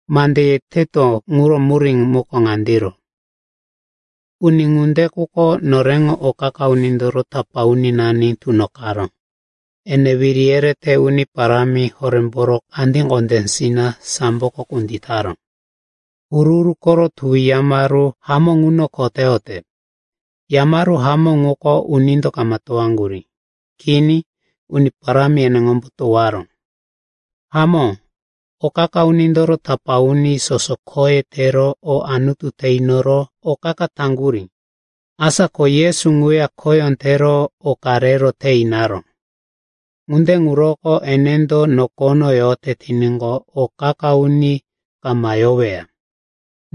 Mande yeteto ŋuro murí ŋuko ŋandiro. Uni ŋunde quko noreŋo o qa-qa unindoro tapá uninani tunoqaró, ene wiri yerete uni parámi horémboro kandí kondésina samboko kunditaró. Huru-huru koro Tuwi Yamaru hamó ŋuno kho teyote. Yamaru hamó ŋuko unindo kama towaŋgurí. Kini. Uni Parámi eneŋombo towaró. Hamó, o qa-qa unindoro tapá uni soso khoye tero o Anutu te inoro o qa-qa taŋgurí. Asa ko Yesu ŋuya khoyó tero oka rero te inaró. Ŋunde ŋuroko enendo nokono yote tiníqo, o qa-qa uni kama yoweya.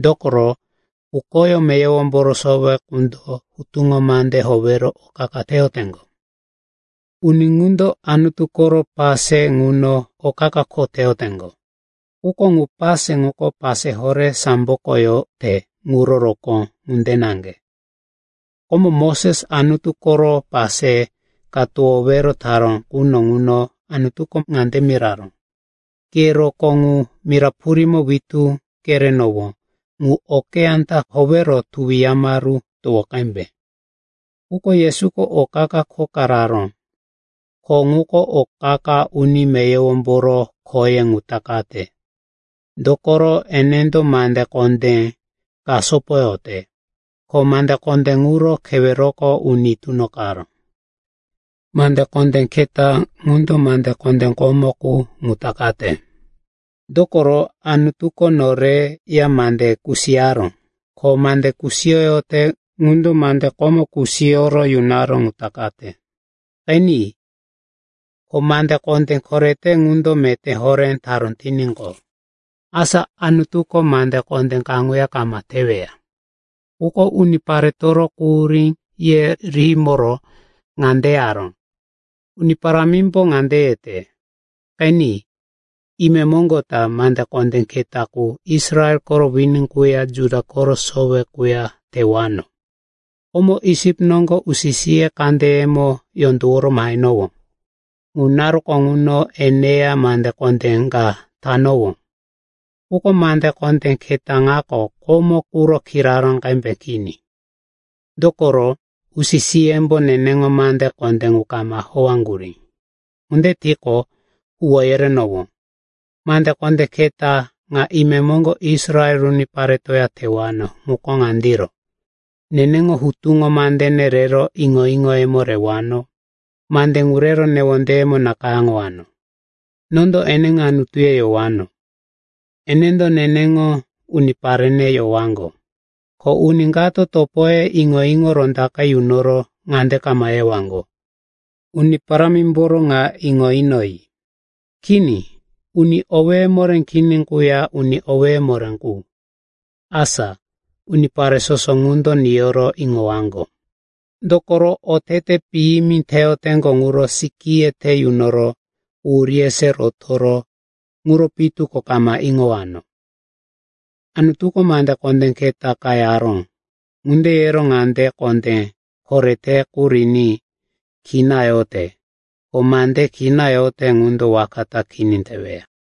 Dokoro, pukoyó meyowomboro sowe qundo hutuŋo mande howero o qa-qa teyoteŋgo. Uni ŋundo Anutu koro pase ŋuno o qa-qa kho teyoteŋgo. Quko ŋu pase ŋuko pase horé samboko yote ŋuro rokóŋo ŋunde naŋge. Komo Moses Anutu koro pase ka towowero taró quno ŋuno Anutuko ŋande miraró, “Ke rokó ŋu mira purímo witú kerenowó ŋu okeyá ta howero tuwi yamaru towo qembe.” Quko Yesuko o qa-qa kho ka raró, kho ŋuko o qa-qa uni meyowomboro khoye ŋu takate. Dokoro enendo mande kondé ka sopoyote, ko mande kondé ŋuro keweroko uni tunoqaró. Mande kondé keta ŋundo mande kondé komo qu ŋu takate. Dokoro Anutuko noreya mande kusiyaró. Ko mande kusiyote ŋundo mande komo kusiyoro yunaró ŋu takate. Qeni, ko mande kondé korete ŋundo meté horé taró tiníqo, asa Anutuko mande kondé kaŋuya kama teweya. Quko uniparetoro quhuríye rihimoro ŋande yaró, “Uni Parámimbo ŋande yete, ‘Qeni, imemoŋgo ta mande kondé keta qu Israel koro wini quya Juda koro sowe quya tewano. Komo Isip noŋgo usi-siye kandeyemo yondoworo mahenowó. Ŋu naruko ŋuno eneya mande kondé ka tanowó. Quko mande kondé keta ŋako komo quro kiraró qembe kini. Dokoro usi-siyembo neneŋo mande kondé ŋu kama howaŋgurí. Ŋunde tiqo, huwó yerenowó. Mande kondé keta ŋa imemoŋgo Israel uniparetoya tewano ŋuko ŋandiro: Neneŋo hutuŋo mandene rero iŋo-iŋoyemo rewano, mande ŋu rero newondeyemo nakayáŋowano. Nondo eneŋo Anutuye yowano, enendo neneŋo uniparene yowaŋgo. Ko uni kato topoye iŋo-iŋo rondaqe yunoro ŋande kama yewaŋgo, “Uni Parámimboro ŋa iŋo inoyi.” Kini, uni owéye moré kini quya uni owéye moré qu, asa, unipare soso ŋundo niyoro iŋowaŋgo. Dokoro, otete piyimi teyoteŋgo ŋuro sikíye te yunoro quhuríye se rotoro ŋuro pitu ko kama iŋowano.’” Anutuko mande kondé keta karo yaró. Ŋunde yero mande kondé korete qu riní kina yote. Ko mande kina yote ŋundo waka ta kini teweya.